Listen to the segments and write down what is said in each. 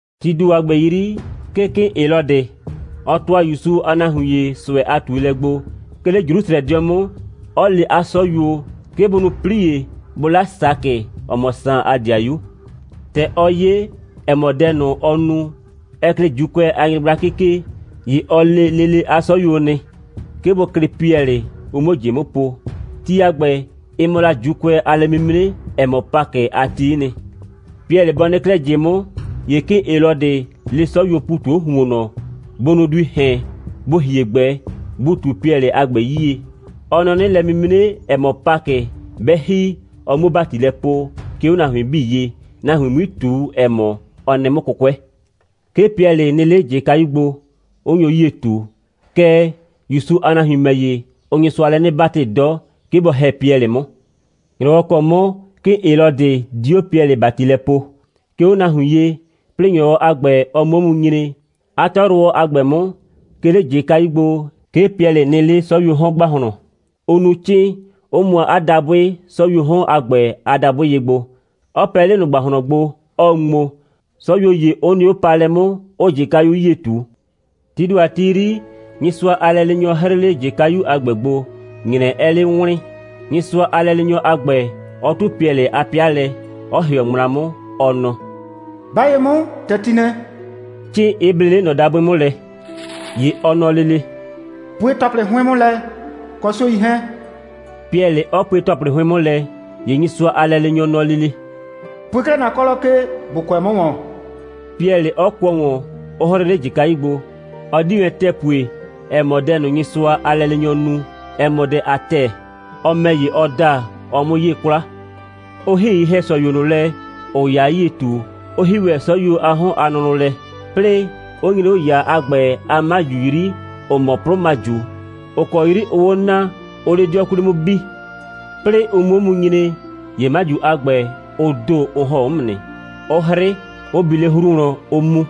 Tii ‑do a ‑gbɛ 'yri, 'ke 'kɩɩn Helɔdɩ, ɔ ‑tʋa ‑Yusu a nahuin ‑ye ꞊sʋɛ a ꞊tuelɛ gbo, 'ke 'le Jrusrɛdɩɔ 'mʋ, 'ɔ le 'a 'sɔyuo, 'ke bʋ nu 'plie, bʋ 'la Sakɩ, ‑ɔ mɔ Saan a 'dɩayu. ‑Tɛ ɔ 'ye, ‑ɛ mɔ, dɛ ꞊nʋ, ɔ nu, ɛ klɩɩ ‑Juukʋɛ a nyɩgblakɩ ke, ‑ye ɔ le lele 'a 'sɔyuo nɩ, 'ke bʋ klɩ Piɛlɩ, ʋ 'muo ꞊jɩ 'mʋ po. Ti a ‑gbɛ, ɩ mɔ la ‑Juukʋɛ a lɛ'mimre, ‑ɛ mɔ Pakɩ a ti'i nɩ. Piɛlɩ bɔ nɩ 'klɛɛ ꞊jɩ 'mʋ, ‑ye 'kɩɩn Helɔdɩ le 'sɔyuoo ‑pu ꞊tu 'o ‑huonnɔ, bʋ nu duii ‑hɛn, bʋ ‑hie ꞊gbɛ, bʋ ꞊tu Piɛlɩ a ‑gbɛ 'yie. Ɔ nɔ 'nɩ, lɛ'mimre, ‑ɛ mɔ Pakɩ, 'bɛ ‑hi, ɔ 'muo ‑bati lɛ poo, 'ke 'o nahuin 'bii ye, nahuin 'mui ꞊tu, ‑ɛ mɔ, ɔ nɩ 'mʋ 'kʋkʋɛ. 'Ke Piɛlɩ nɩ 'le ꞊jɩkayu gbo, 'ʋ nyo 'yie ꞊tu. Kɛɛ, ‑Yusu a nahuin ‑mɛ ‑ye, ʋʋ Nyɩsʋa lɛ 'nɩ 'batɩ 'dɔ, 'ke bɔ ‑hɛ Piɛlɩ 'mʋ. ‑Nyrɔwɔ ‑kɔ 'mʋ 'kɩɩn Helɔdɩ di 'o Piɛlɩ ‑bati lɛ poo, 'ke 'o nahuin ye, 'plɩɩ ‑nyrɔwɔ a ‑gbɛ, ɔ 'mʋ 'o mu nyre, 'a 'tɔyrʋwɔ a ‑gbɛ 'mʋ, 'ke 'le ꞊jɩkayu gbo, 'ke Piɛlɩ nɩ 'le 'sɔyuoo 'hɔn ‑gbahlɔn, 'ʋ nu 'cɩɩn, 'ʋ mʋa 'a dabʋɩ 'sɔyuoo 'hɔn a ‑gbɛ a dabʋɩ ye gbo, 'ɔ pɛ 'le ꞊nʋ ‑gbahlɔn gbo, 'ɔɔ ŋmo, 'sɔyuo ‑ye 'ʋ nɩ 'o paalɛ 'mʋ, 'ʋʋ ꞊jɩkayu 'yie ꞊tu. Tii ‑do a ti 'yri, Nyɩsʋa a lɛleenyɔ 'hrɩɩ 'le ꞊jɩkayu a ‑gbɛ gbo, ‑nyrɛ 'ɛɛ 'le wlɩɩn, Nyɩsʋa a lɛleenyɔ a ‑gbɛ 'ɔ 'tʋ Piɛlɩ a 'pɩa lɛ, 'ɔ ‑hɩɔ ŋmla 'mʋ, ɔ nɔ: «'Ba ye 'mʋ ‑tɛ ti nɛ,» 'cɩɩn 'ɩ ble 'le ꞊nɔ dabʋɩ 'mʋ lɛ. ‑Ye ɔ nɔ lele: «Pue ‑tɔplɩ 'hʋɩn 'mʋ lɛ, kɔ 'suei 'hɛɛn,» Piɛlɩ 'ɔ pue ‑tɔplɩ 'hʋɩn 'mʋ lɛ. ‑Ye Nyɩsʋa a lɛleenyɔ nɔ lele: «Pue 'klɛɛ ‑na 'kɔlɔ ke, ‑bo kʋɛ 'mʋ ‑wɔn,» Piɛlɩ 'ɔ kʋɔ ‑wɔn, 'ɔ 'hrɩ 'le ꞊jɩkayu gbo. Ɔ 'di wɛn ‑tɛɛ pue, ‑ɛ mɔ, dɛ ꞊nʋ, Nyɩsʋa a lɛleenyɔ nu, ɛ mɔ dɛ a ‑tɛɛ. Ɔ ‑mɛ ‑ye, ɔ da, ɔɔ 'mʋ 'yee 'kwla. Ʋ ‑hi ye‑hɛsɔyuo ꞊nʋ lɛ, ‑ʋʋ ‑yaa 'yie ꞊tu, 'ʋ ‑hi ‑wɛ 'sɔyuo a 'hɔn a nʋnʋ lɛ, 'plɩɩ 'ʋ nyre 'o ‑yaa a ‑gbɛ a 'maju 'yri, ‑ʋ mɔ 'plʋmaju, ‑ʋ kɔ 'yri ʋʋ 'o naa, 'ʋʋ 'le 'dɩɔ 'kwli 'mʋ bi. 'Plɩɩ ʋ 'mʋ 'o mu nyre, ‑ye 'maju a ‑gbɛ, ʋ ‑do, ʋ ‑hɔn 'o 'mʋ nɩ, 'ʋ 'hrɩ, 'ʋ bi 'le 'hru wlɔn, 'ʋʋ mu.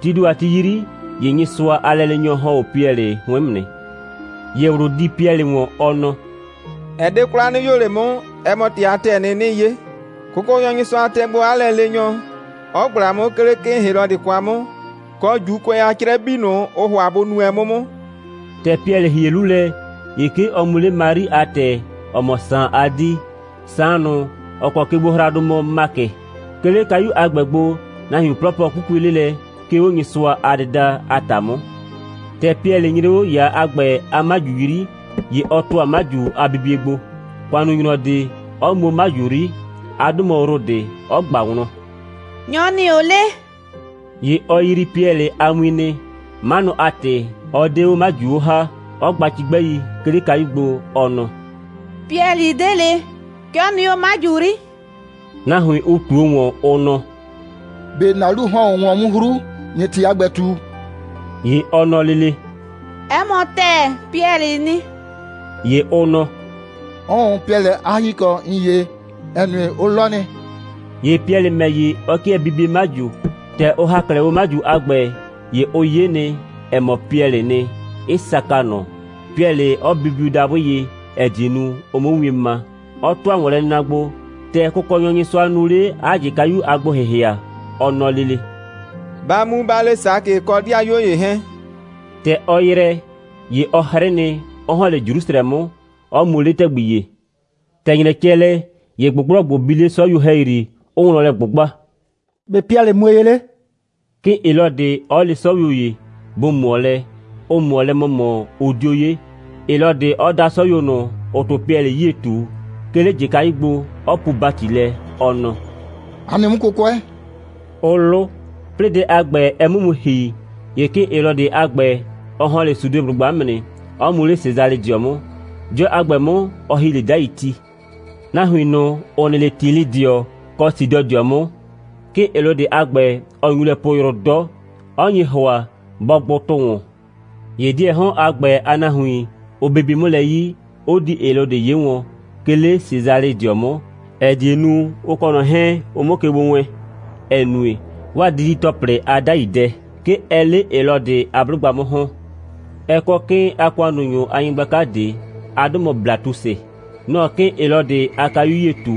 Tii ‑do a ti 'yri, ‑ye Nyɩsʋa a lɛleenyɔ ‑hɔn 'o Piɛlɩ 'hʋɩn 'mʋ nɩ. ‑Ye ꞊wlʋ di Piɛlɩ ‑wɔn, ɔ nɔ: «Ɛ 'de 'kwla, 'nɩ 'yoo ꞊le 'mʋ, ɛ mɔ ‑tɩ a ‑tɛɛ nɩ, 'nɩɩ 'ye. Kʋkɔnyɔ Nyɩsʋa tɛ gbo 'a lɛleenyɔ, 'ɔ ꞊gbla 'mʋ, 'ke 'le 'kɩɩn Helɔdɩ kwa 'mʋ, kɔ ‑Juukʋɛ a 'crɛ 'bii ꞊nʋ, ʋʋ ‑hʋa bʋ nu wɛn 'mʋ 'mʋ.» ‑Tɛ Piɛlɩ ‑hie 'lu lɛ, ‑ye 'ke ɔ mu 'le Mari a ‑tɛ, ‑ɔ mɔ Saan a 'dii, Saan ꞊nʋ, ‑ɔ kɔ kegbohraadʋ mɔ Makɩ. 'Ke 'le kayu a ‑gbɛ gbo, nahuin 'plɔplɔ 'kukue 'le lɛ, 'ke 'o Nyɩsʋa a dɩda a ‑ta 'mʋ. ‑Tɛ Piɛlɩ nyre 'o ‑yaa a ‑gbɛ a 'maju 'yri, ‑ye ɔ ‑tʋa 'maju a bibie gbo, ‑kʋannunyrɔ ꞊de, 'ɔ mu 'o 'maju 'yri, 'a 'dʋ mɔ Rodɩ, 'ɔ ꞊gba wlɔn: «Nyɔ‑ nɩ 'o 'le?» ‑Ye ɔ yrii Piɛlɩ a win nɩ. 'Manʋ a ‑tɩ, 'ɔ 'de 'o 'maju 'o ‑ha, 'ɔ gba cigbɛi, 'ke 'le kayu gbo, ɔ nɔ: «Piɛlɩ 'de ꞊le. 'Ke ɔ nɩ 'o 'maju 'yri.» Nahuin, ʋ ꞊tuo ‑wɔn, ʋ nɔ: «꞊Be ‑na 'lu ‑hɔn 'o wlɔn 'mʋ 'hru, ꞊nɩɩ ‑tɩ a ‑gbɛ ꞊tu?» ‑Ye ɔ nɔ lele: «'Ɛ mɔ ‑tɛɛ, Piɛlɩɩ nɩ.» ‑Ye ʋ nɔ: «'Ʋʋn, Piɛlɩ a ‑hikɔ ‑n 'ye, ‑ɛ nue, ʋ 'lɔ nɩ.» ‑Ye Piɛlɩ ‑mɛ ‑ye, ɔ 'kɩɛ bibie 'maju. ‑Tɛ ʋ ‑ha 'klɛɛ 'o 'maju a ‑gbɛ, ‑ye ʋ 'ye nɩ, ‑ɛ mɔ, Piɛlɩɩ nɩ, 'ɩ saka ꞊nʋ, Piɛlɩ 'ɔ bibiu dabʋ ye, ‑ɛ die nu, ʋ 'mʋ wien ma, 'ɔ ‑tʋa ‑wɔnlɛnɩna gbo, ‑tɛ Kʋkɔnyɔ Nyɩsʋa nu 'le 'a ꞊jɩkayu a gbo‑hɩhɩa. Ɔ nɔ lele: «Ba mu, ba le Sakɩ kɔ 'dɩayuo ‑ye 'hɛɛn.» ‑Tɛ ɔ ‑yrɛ, ‑ye ɔ 'hrɩ nɩ, 'ɔ ‑hɔn 'le Jrusrɛ 'mʋ, 'ɔ mu 'le ‑tɛgbi ‑ye. ‑Tɛ ‑nyrɛ cɛ lɛ, ‑ye ꞊gbʋgblɔgbʋ bi 'le 'sɔyuo ‑hɛyri, 'ʋʋ wlɔn lɛ ꞊gbʋgba: «‑Be' Piɛlɩ mue ye 'le?» 'kɩɩn Helɔdɩ 'ɔ le 'sɔyuo ‑ye, bʋ ꞊mʋɔ lɛ, 'ʋ ꞊mʋɔ lɛ ‑mɔmɔ, 'ʋ 'dio 'ye, Helɔdɩ 'ɔ da 'sɔyuo ꞊nʋ, ‑ʋʋ 'tʋ Piɛlɩ 'yie ꞊tu, 'ke 'le ꞊jɩkayu gbo, 'ɔ puu ‑bati lɛ, ɔ nɔ: «A nɩ 'mʋ 'kʋkʋɛ,» 'ʋ 'lʋ. 'Plɩɩ dɛ a ‑gbɛ, ɛ 'mʋ mu ‑hi, ‑ye 'kɩɩn Helɔdɩ a ‑gbɛ, ɔ ‑hɔn 'le Sudeblʋgba 'mʋ nɩ, 'ɔ mu 'le Sesalɩdɩɔ 'mʋ. 'Dɩɔ a ‑gbɛ 'mʋ, ɔ ‑hi 'le 'dai ti. Nahuin ꞊nʋ, ‑ʋ nɩ 'le Tilɩdɩɔ kɔ Sidɔdɩɔ 'mʋ, 'kɩɩn Helɔdɩ a ‑gbɛ, ɔ nyu lɛ poo yrʋ 'dɔ, 'ɔ nye ‑hʋa, bɔ gbʋ tʋ ‑wɔn. ‑Ye 'dɩɛɛ 'hɔn a ‑gbɛ a nahuin, ʋ bibi 'mʋ lɛ 'yi, 'ʋ di Helɔdɩ 'ye wɔn, 'ke 'le Sesalɩdɩɔ 'mʋ, ‑ɛ die nu, ʋ kɔ ꞊nɔ 'hɛɛn, ʋ 'mʋ ke gbo wɛɛn, ‑ɛ nue, 'waa didi‑tɔplɩ a 'dai dɛ, 'ke ɛɛ 'le Helɔdɩ a 'blʋgba 'mʋ ‑hɔn. Ɛ kɔ 'kɩɩn a ‑kʋannunyʋ a nyɩgblaka ꞊de. 'A 'dʋ mɔ Blatusɩ. Nɔ‑ɔ 'kɩɩn Helɔdɩ a kayu 'yie ꞊tu.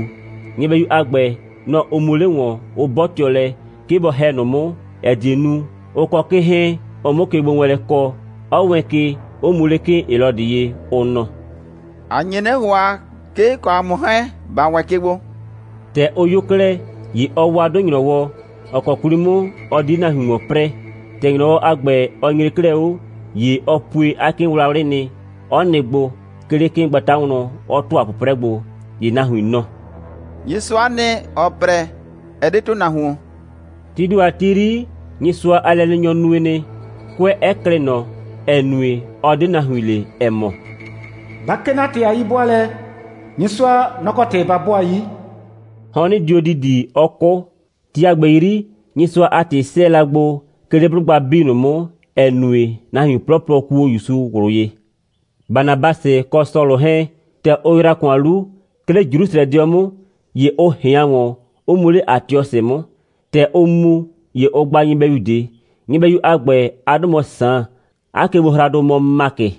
Nyɩbɛyu a ‑gbɛ, nɔ‑ ʋ mu 'le ‑wɔn, 'ʋ 'bɔtɩɔ lɛ, 'ke bɔ ‑hɛ ꞊nʋ 'mʋ, ‑ɛ die nu, ʋ kɔ 'kɩɩn 'hɛɛn, ʋ 'mʋ kegbowɛɛnlɛ kɔ, 'ɔ wɛɛn ke, 'ʋ mu 'le 'kɩɩn Helɔdɩ ye, ʋ nɔ: «‑A nye 'nɩ ‑hʋa, 'ke ‑n kɔ ‑a mʋ 'hɛɛn, ‑ba wɛɛn ke gbo.» ‑Tɛ ʋ 'yo 'klɛɛ, ‑ye ɔ wa 'dʋ ‑nyrɔwɔ, ‑ɔ kɔ 'kwli 'mʋ ɔ di 'le nahuin ‑wɔn 'prɛɛ. ‑Tɛ ‑nyrɔwɔ a ‑gbɛ, ɔ nyre 'klɛɛ 'o, ‑ye ɔ pue 'a 'kɩɩnwlawlʋ nɩ, 'ɔ nɩ gbo, 'ke 'le 'kɩɩngbata wlɔn, 'ɔ ‑tʋa 'pʋprɛ gbo. ‑Ye nahuin nɔ: «Nyɩsʋa'a nɩ, ‑ɔɔ 'prɛ, ɛ 'de ‑tʋnahuon.» Tii ‑do a ti 'yri, Nyɩsʋa a lɛleenyɔ nue nɩ, 'kʋɛ 'ɛ klɩ ꞊nɔ, ‑ɛ nue, ɔ 'de nahuin le, ‑ɛ mɔ: «Ba 'kee 'na ‑tɩ a 'yi'bʋaalɛ, Nyɩsʋa, nɔ‑ kɔ ‑tɩ ba 'bʋaa 'yi.» Hɔnnɩ dio ‑didi, 'ɔ 'kʋ. Ti a ‑gbɛ 'yri, Nyɩsʋa a ‑tɩ 'sɛɛ la gbo, 'ke 'le 'blʋgba 'bii ꞊nʋ 'mʋ, 'ɛ nue, nahuin 'plɔplɔ 'ʋ kuo ‑Yusu ꞊wlʋ ye. Banabasɩ kɔ Sɔlʋ 'hɛɛn, ‑tɛ ʋ ‑yra ‑kʋan 'lu, 'ke 'le Jrusrɛdɩɔ 'mʋ, ‑ye ʋ ꞊hɩan ‑wɔn, 'ʋ mu 'le Atiɔsɩ 'mʋ. ‑Tɛ ʋʋ mu, ‑ye ʋ gba nyɩbɛyu ꞊de. Nyɩbɛyu a ‑gbɛ, 'a 'dʋ mɔ Saan, 'a kegbohraadʋ mɔ Makɩ.